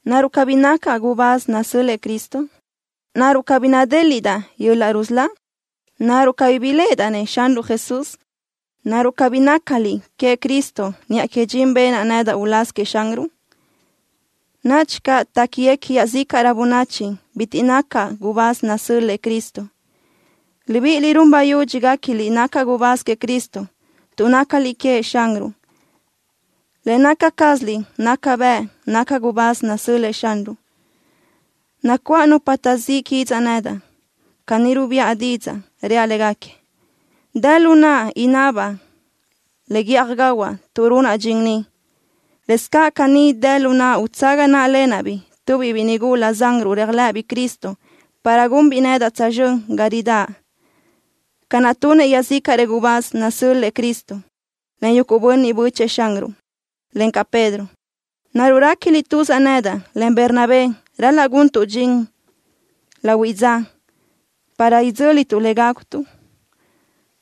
¿Naruʼ cabí nacaʼ gubáz nasö́l-lëʼë Cristo? ¿Naruʼ cabí nadéliʼdaʼ yöl-laʼ rusölá? ¿Naruʼ cabí biléʼedaʼ-nëʼ Xanruʼ Jesús? ¿Naruʼ cabí nácaliʼ queëʼ Cristo niʼa que dxin benaʼ nedaʼ uláz queëʼ Xanruʼ? Nadxi caʼ téquiguequi iaʼzícaʼrö bönachi bitiʼ nacaʼ gubáz nasö́l-lëʼë Cristo. Libíʼiliʼ run bayudxi guéquiliʼ nacaʼ gubáz queëʼ Cristo. Tuʼ nácaliʼ queëʼ Xanruʼ, le naca cázaliʼ naca bëʼ nacaʼ gubáz nasö́l-lëʼë Xanruʼ. Nacuáʼ nupa taʼzíʼ quidzaʼ nedaʼ. Caní rubiʼa didzaʼ, reaʼ légaquiëʼ: Dë lu naʼa inabaʼ le guíʼaj gahuaʼ tuʼ runaʼ dxin ni. Lëscaʼ caní dë lu naʼa utsaga náʼalenaʼ-biʼ tubiʼ biʼi nigula zanruʼ réajlëʼëbiʼ Cristo para gunbiʼ nedaʼ tsözxö́n ga ridáʼ, ca naʼ tunëʼ iaʼzícaʼrëʼ gubáz nasö́l-lëʼë Cristo, en yuguʼ bönniʼ bö́chëʼë Xanruʼ, encaʼ Pedro. ¿Naruʼ réquiliʼ tuzaʼ nedaʼ, en Bernabé ral-laʼ guntuʼ dxin lahuiʼ dza, para idzö́lituʼ le gágutuʼ?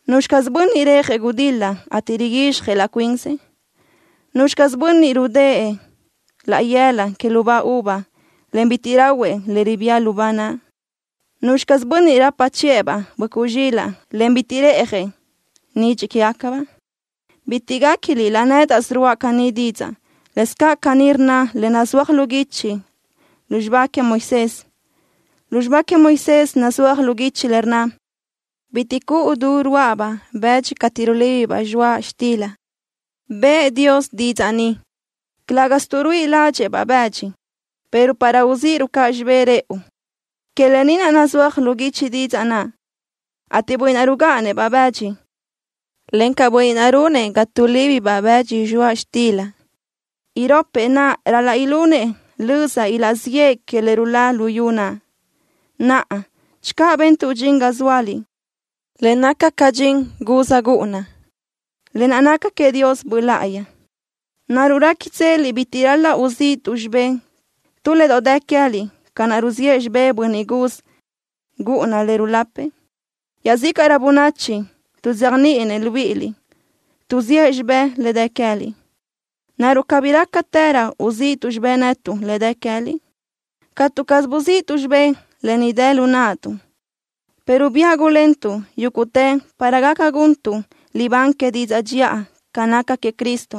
¿Nuzxi caz bönniʼ rejëʼ gudil-la, ateʼ riguizxjëʼ laʼ cuinsëʼ? ¿Nuzxi caz bönniʼ rudë́ʼë tu laʼ yëla que lubá uva, en bitiʼ rahuëʼ le ribía lubá naʼ? ¿Nuzxi caz bönniʼ rapa chiʼë-baʼ böʼcuʼ zxilaʼ, en bitiʼ reʼjëʼ nidxiʼ quégacabaʼ? Bitiʼ guéquiliʼ laʼ nédaʼsö ruáʼa caní didzaʼ. Lëscaʼ caní rnna le nazúaj lu guichi lu xibá queëʼ Moisés. Lu xibá queëʼ Moisés nazúaj lu guichi le rnna: Bitiʼ cuʼu du rúaʼabaʼ bëdxi cateʼ rulíbibaʼ zxoaʼ xtila. Bëʼë Dios didzaʼ ni, calë́gasö tuʼ ruíʼi ládxëʼë-baʼ bëdxi, pero para uzíʼiruʼ caʼ xibé rëʼu. Que lë ni naʼ nazúaj lu guichi didzaʼ naʼ, ateʼ bönniʼ naʼ rugáʼanëʼ-baʼ bëdxi, encaʼ bönniʼ naʼ runëʼ ga tuʼlíbibaʼ bëdxi zxoaʼ xtila, iropëʼ naʼ ral-laʼ ilunëʼ löza ilaʼziʼë que le ruláʼ luyú naʼ. Naʼa, channö bentuʼ dxin ga zóaliʼ, le naca ca dxin guz gúʼuna, lë naʼ naca queëʼ Dios Böʼ Láʼayi, ¿naruʼ réquitseliʼ bitiʼ ral-laʼ uzíʼituʼ xibé tu le doʼ dë queë́liʼ ca naʼ ruziʼë xibé bönniʼ guz gúʼuna le rulapëʼ? Iaʼzícaʼrö bönachi tuʼzéajniʼinëʼ libíʼiliʼ tuʼziʼë xibé le dë queë́liʼ. ¿Naruʼ cabí rálaʼtërö uzíʼituʼ xibé netuʼ le dë queë́liʼ? Catu caz buziʼtuʼ xibé lë ni dë lu naʼtuʼ, pero biáʼ gulentuʼ yúguʼtë para gaca guntuʼ libán que didzaʼ dxiʼa ca naca queëʼ Cristo.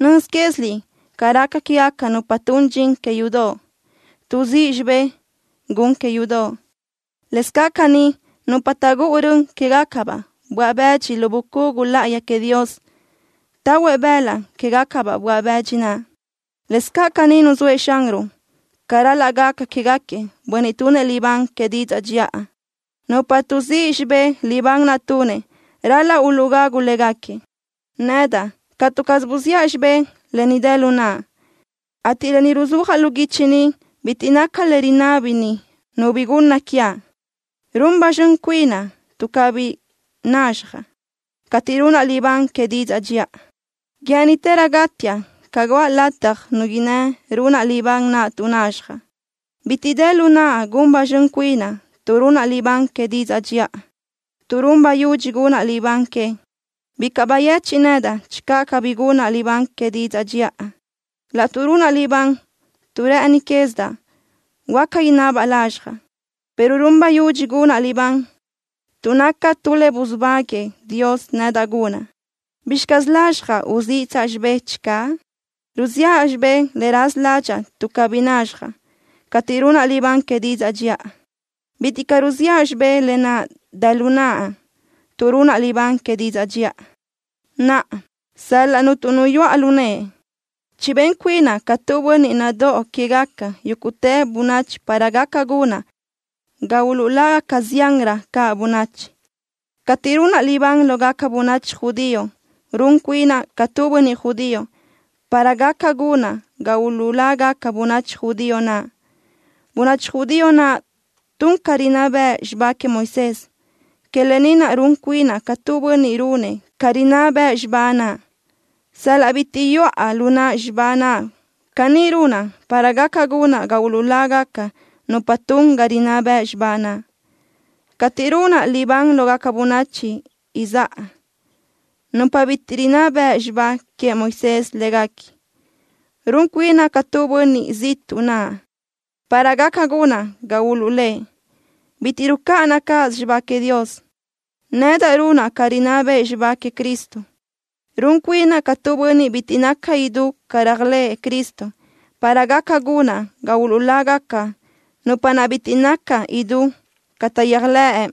Nöz quéziliʼ ca raca quégaca nupa tun dxin que yudoʼ, tuʼzíʼ xibé gun que yudoʼ. Lëscaʼ caní nupa taʼgúʼu rön quégacabaʼ böaʼ bëdxi lu bucugu láʼayi queëʼ Dios, tahuëʼ bëlaʼ quégacabaʼ böaʼ bëdxi naʼ. Lëscaʼ caní nuzóëʼ Xanruʼ ca ral-laʼ gaca quégaquiëʼ bönniʼ tunëʼ libán que didzaʼ dxiʼa. Nupa tuʼzíʼ xibé libán naʼ tunëʼ ral-laʼ uluʼgagu légaquiëʼ. Nedaʼ catu caz buziʼa xibé lë ni dë lu naʼa, ateʼ lë ni ruzúajaʼ lu guichi ni bitiʼ naca le rinábini nu bi gunna quiaʼ. Run ba zxön cuinaʼ tuʼ cabí nazxjaʼ cateʼ runaʼ libán que didzaʼ dxiʼa. Guë́ʼënitëraʼ gátiaʼ ca guʼa lataj nu innë́ runaʼ libán naʼ tuʼ nazxjaʼ. Bitiʼ dë lu naʼa gun ba zxön cuinaʼ tuʼ runaʼ libán que didzaʼ dxiʼa, tuʼ run bayudxi gunaʼ libán que. Bicaʼ bayechiʼ nedaʼ channö cabí gunaʼ libán que didzaʼ dxiʼa. Laʼtuʼ runaʼ libán tuʼ rë́ʼëni quézidaʼ, huáca inabaʼ lazxjaʼ, pero run bayudxi gunaʼ libán, tuʼ naca tu le busubáguëʼë Dios nedaʼ gunaʼ. ¿Bizxi lazxjaʼ uziʼtsaʼ xibé channö? Ruziʼa xibé le raza ládxaʼa tuʼ cabí nazxjaʼ cateʼ runaʼ libán que didzaʼ dxiʼa. Bitiʼ caʼ ruziʼa xibé lë naʼ dë lu naʼa tuʼ runaʼ libán que didzaʼ dxiʼa. Naʼa, sal-laʼ cuntu nu yuʼa lu nëʼe, chibén cuinaʼ ca tu bönniʼ nadóʼo quégaca yúguʼtë bönachi para gaca gunaʼ ga uluʼlágaca ziánrö caʼ bönachi. Cateʼ runaʼ libán lógaca bönachi judío, run cuinaʼ ca tu bönniʼ judío para gaca gunaʼ ga uluʼlágaca bönachi judío naʼ. Bönachi judío naʼ tun ca rinná bëʼ xibá queëʼ Moisés. Que lë ni naʼ run cuinaʼ ca tu bönniʼ runëʼ ca rinná bëʼ xibá naʼ sal-laʼ bitiʼ yuʼa lu naʼ xibá naʼ. Caní runaʼ para gaca gunaʼ ga uluʼlágaca nupa tun ca rinná bëʼ xibá naʼ. Cateʼ runaʼ libán lógaca bönachi izáʼa, nupa bitiʼ rinná beʼe xibá queëʼ Moisés léguequi, run cuinaʼ ca tu bönniʼ ziʼtuʼ naʼ, para gaca gunaʼ ga uluʼlë́ʼ. Bitiʼ rucáʼanaʼ cáʼasö xibá queëʼ Dios. Nedaʼ runaʼ ca rinná bëʼ xibá queëʼ Cristo. Run cuinaʼ ca tu bönniʼ bitiʼ naca idú ca réajlëʼë Cristo para gaca gunaʼ ga uluʼlágaca nupa naʼ bitiʼ naca idú ca taʼyéajlëʼ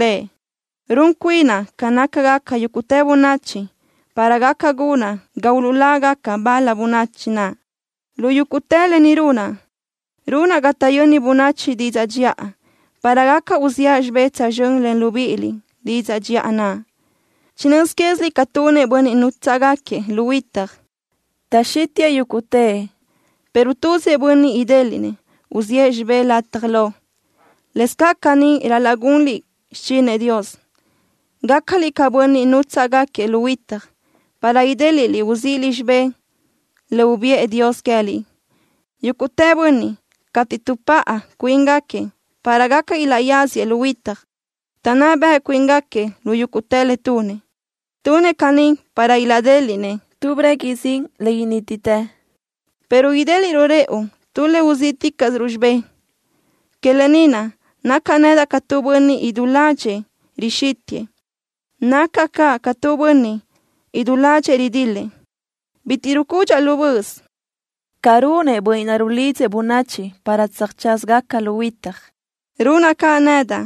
Lëʼ. Run cuinaʼ ca nácagaca yúguʼtë bönachi para gaca gunaʼ ga uluʼlágaca bal-la bönachi naʼ. Lu yúguʼtë lë ni runaʼ, runaʼ ga taʼyöni bönachi didzaʼ dxiʼa, para gaca uziʼa xibé tsözxö́n len libíʼiliʼ didzaʼ dxiʼa naʼ. Chinö́z quéziliʼ ca tunëʼ bönniʼ nútsaʼgaquiëʼ lu huitaj. Taʼxítiʼë yúguʼtëʼ, pero tuzëʼ bönniʼ idéliʼnëʼ uziʼë xibé lataj lo. Lëscaʼ caní ral-laʼ gunliʼ xichinëʼ Dios, gácaliʼ ca bönniʼ nútsaʼgaquiëʼ lu huitaj, para idéliʼliʼ uzíʼiliʼ xibé le ubiʼë Dios queë́liʼ. Yúguʼtë bönniʼ, cateʼ tuʼpáʼa cuíngaquiëʼ para gaca ilaʼyáziëʼ lu huitaj, taʼnná beʼe cuíngaquiëʼ lu yúguʼtë le tunëʼ. Tunëʼ caní para ilaʼdéliʼnëʼ tu breguiʼ zin le inítitë, pero idéliʼruʼ rëʼu tu le uzíʼticaʼsiruʼ xibé. Que lë ni naʼ, nacaʼ nedaʼ ca tu bönniʼ idú ládxëʼë rixítiʼë. Nacaʼ caʼ ca tu bönniʼ, idú ládxëʼë ridil-lëʼ. Bitiʼ rucudxaʼ lu böʼös. Ca runëʼ bönniʼ naʼ rulidzëʼ bönachi para tsöjtsázagaca lu huitaj, runaʼ caʼ nedaʼ,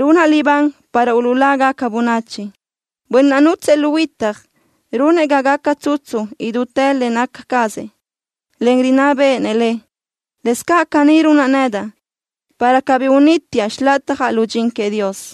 runaʼ libán para uluʼlágaca bönachi. Bönniʼ naʼ nútsëʼë lu huitaj runëʼ ga gaca tsutsu idútë le naca cazëʼ, en rinná béʼenëʼ le. Lëscaʼ caní runaʼ nedaʼ, para cabí unítiaʼ xilatjaʼ lu dxin queëʼ Dios.